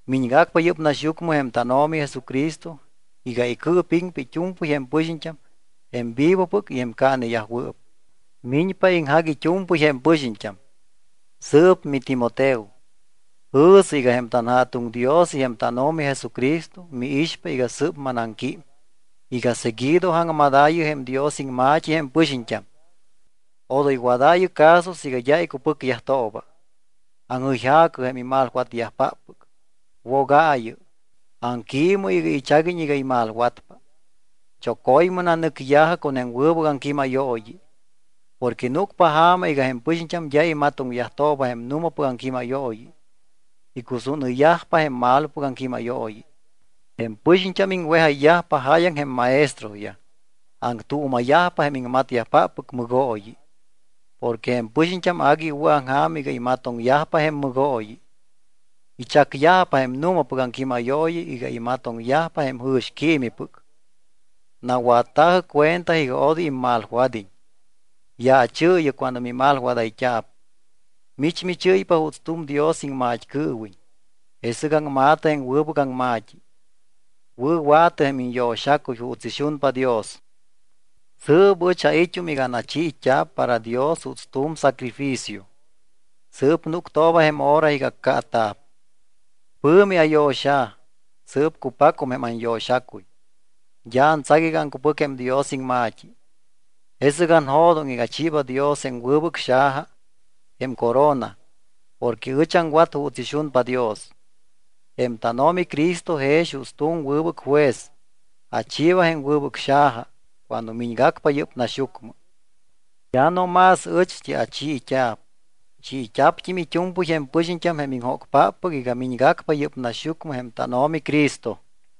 Miñgacpa yɨ́p naxyucmɨ jém tánO̱mi Jesucristo iga icɨɨpiŋpa it́u̱mpɨy jém pɨxiñt́am jém vivopɨc y jém caaneyajwɨɨp. Miñpa iŋjac it́u̱mpɨy jém pɨxiñt́am. Sɨɨp miTimoteo, jɨ̱sɨ iga jém tanJa̱tuŋ Dios y jém tánO̱mi Jesucristo miixpa iga sɨ́p manaŋquím iga seguido aŋmadaayɨ jém Dios iŋma̱t́i jém pɨxiñt́am. Odoy wadaayɨ caso siiga d́a icupɨcyajtooba. Aŋjɨyja̱cɨ jém imalwatyajpáppɨc, wogaayɨ, aŋquiimɨ iga ichaguiñ iga imalwatpa. Choco̱ymɨ nanɨcya̱jɨ con jém wɨbɨc aŋquímayooyi. Porque núcpa ja̱ma iga jém pɨxiñt́am d́a imatoŋyajtooba jém nu̱mapɨc aŋquímayooyi. Icusúnɨyyajpa jém malopɨc aŋquímayooyi. Jém pɨxiñt́am iŋwejayyajpa jáyaŋ jém maestroyaj. Aŋtuuma̱yajpa jém iŋmatyajpáppɨc mɨgooyi. Porque jém pɨxiñt́am agui iwɨ̱aŋja̱m iga imatoŋyajpa jém mɨgooyi. Ichacyajpa jém nu̱mapɨc aŋquímayooyi iga imatoŋyajpa jém jɨ̱xquiimipɨc. Nawatta̱jɨ cuenta iga odoy immalwad́iñ. Yaachɨɨyɨ cuando mimalwadayt́a̱p. Mich michɨ́ypa juuts tu̱m Dios iŋmat́cɨɨwiñ, jesɨc aŋma̱tɨ jém wɨbɨc aŋma̱t́i, wɨ̱wa̱tɨ jém iñyo̱xacuy juuts ixunpa Dios. Sɨɨp ɨch ait́um iga anachiit́a̱p para Dios juuts tu̱m sacrificio. Sɨɨp núctooba jém hora iga accaata̱p. Pɨ̱mi ayo̱xa̱. Sɨɨp cupacum jém anyo̱xacuy. D́a antsac iga aŋcupɨc jém Dios iŋma̱t́i. Jesɨc anjo̱doŋ iga achiiba Dios jém wɨbɨc xaja, jém corona, porque ɨch aŋwat juuts ixunpa Dios. Jém tánO̱mi Cristo jex juuts tu̱m wɨbɨc juez, achiiba jém wɨbɨc xaja cuando miñgacpa yɨ́p naxyucmɨ. D́a no más ɨcht́i achiit́a̱p, chiit́a̱pt́im it́u̱mpɨy jém pɨxiñt́am, jém iŋjócpáppɨc iga miñgacpa yɨ́p naxyucmɨ jém tánO̱mi Cristo.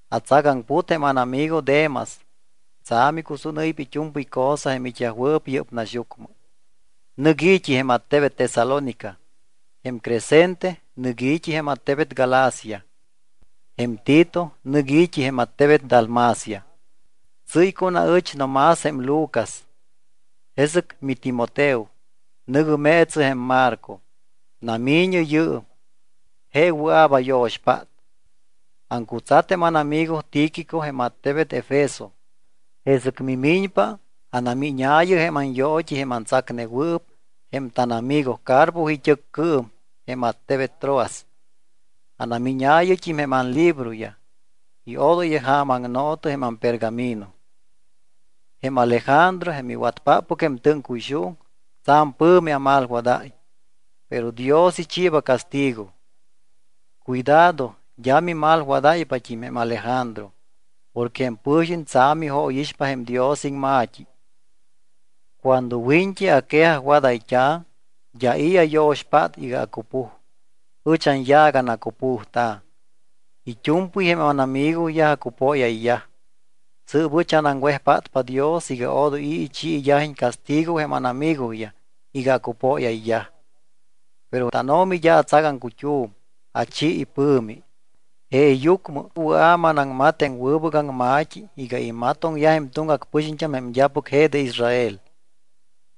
Atsagaŋput jém ánamigo Demas. Tsa̱m icusúnɨ́ypa it́u̱mpɨy cosa jém it́yajwɨɨp yɨ́p naxyucmɨ. Nɨc i̱t́i jém attebet Tesalónica. Jém Crescente nɨc i̱t́i jém attebet Galacia. Jém Tito nɨc i̱t́i jém attebet Dalmacia. Tsɨ́y con aɨch no más jém Lucas. Jesɨc miTimoteo, nɨ̱gɨ meetsɨ jém Marco. Nami̱ñɨ yɨɨm. Je wɨa̱p ayo̱xpát. Aŋcutsat jém ánamigo Tíquico jém attebet Efeso. Jesɨc mimiñpa, anamíñaayɨ jém anyoot́i jém antsacnewɨɨp jém tánamigo Carpo it́ɨccɨɨm jém attebet Troas. Anamíñaayɨt́im jém anlibroyaj y odoy jaamaŋno̱tɨ jém ampergamino. Jém Alejandro, jém iwatpáppɨc jém tɨ́ŋcuyxuuŋ, tsa̱m pɨ̱mi amalwadáy. Pero Dios ichiiba castigo. Cuidado d́a mimalwadáypat́im jém Alejandro. Porque jém pɨ̱xiñ tsa̱m ijóyixpa jém Dios iŋma̱t́i. Cuando wiñt́i aquejajwadayt́a̱, d́a i̱ ayo̱xpát iga acupuj. Ɨch anyaac anacupujta̱. It́u̱mpɨy jém ánamigoyaj acupóyayyaj. Sɨɨp ɨch anaŋwejpátpa Dios iga odoy i̱ ichiiyajiñ castigo jém ánamigoyaj iga acupóyayyaj. Pero tánO̱mi d́a atsac aŋcut́um, achi ipɨ̱mi. Jeeyucmɨ wɨa̱ manaŋmat jém wɨbɨc aŋma̱t́i iga imatoŋyaj jém tuŋgac pɨxiñt́am jém d́apɨc je de Israel.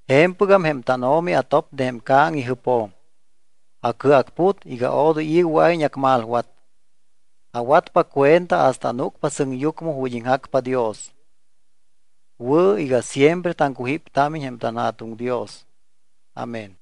Je̱mpɨgam jém tánO̱mi atop de jém ca̱ŋ ijɨpjo̱m. Acɨacput iga odoy i̱ wɨa̱iñ acmalwat. Awatpa cuenta hasta anúcpa sɨŋyucmɨ ju̱t́ iŋjacpa Dios. Wɨ̱ iga siempre taŋcujíptámiñ jém tanJa̱tuŋ Dios. Amén.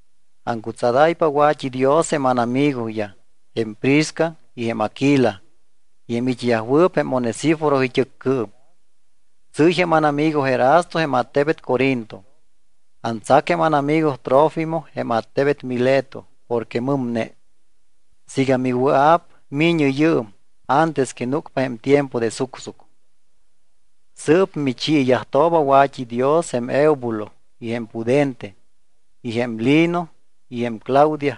Aŋcutsadáypa wa̱t́idios jém ánamigoyaj, jém Prisca y jém Aguila y jém it́yajwɨɨp jém Onesíforo it́ɨccɨɨm. Tsɨ́y jém ánamigo Erasto jém attebet Corinto. Antsac jém ánamigo Trófimo jém attebet Mileto porque mɨmne. Siiga miwɨa̱p mi̱ñɨ yɨɨm antes que núcpa jém tiempo de sucsuc. Sɨɨp michiiyajtooba wa̱t́idios jém Eubulo y jém Pudente y jém Lino y jém Claudia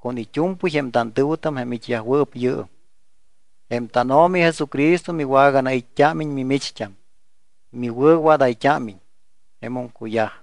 con it́u̱mpɨy jém tantɨ̱wɨtam jém it́yajwɨɨp yɨɨm. Jém tánO̱mi Jesucristo miwaganait́t́ámiñ, mimicht́am, miwɨ̱wadayt́ámiñ. Jemum cuyaj.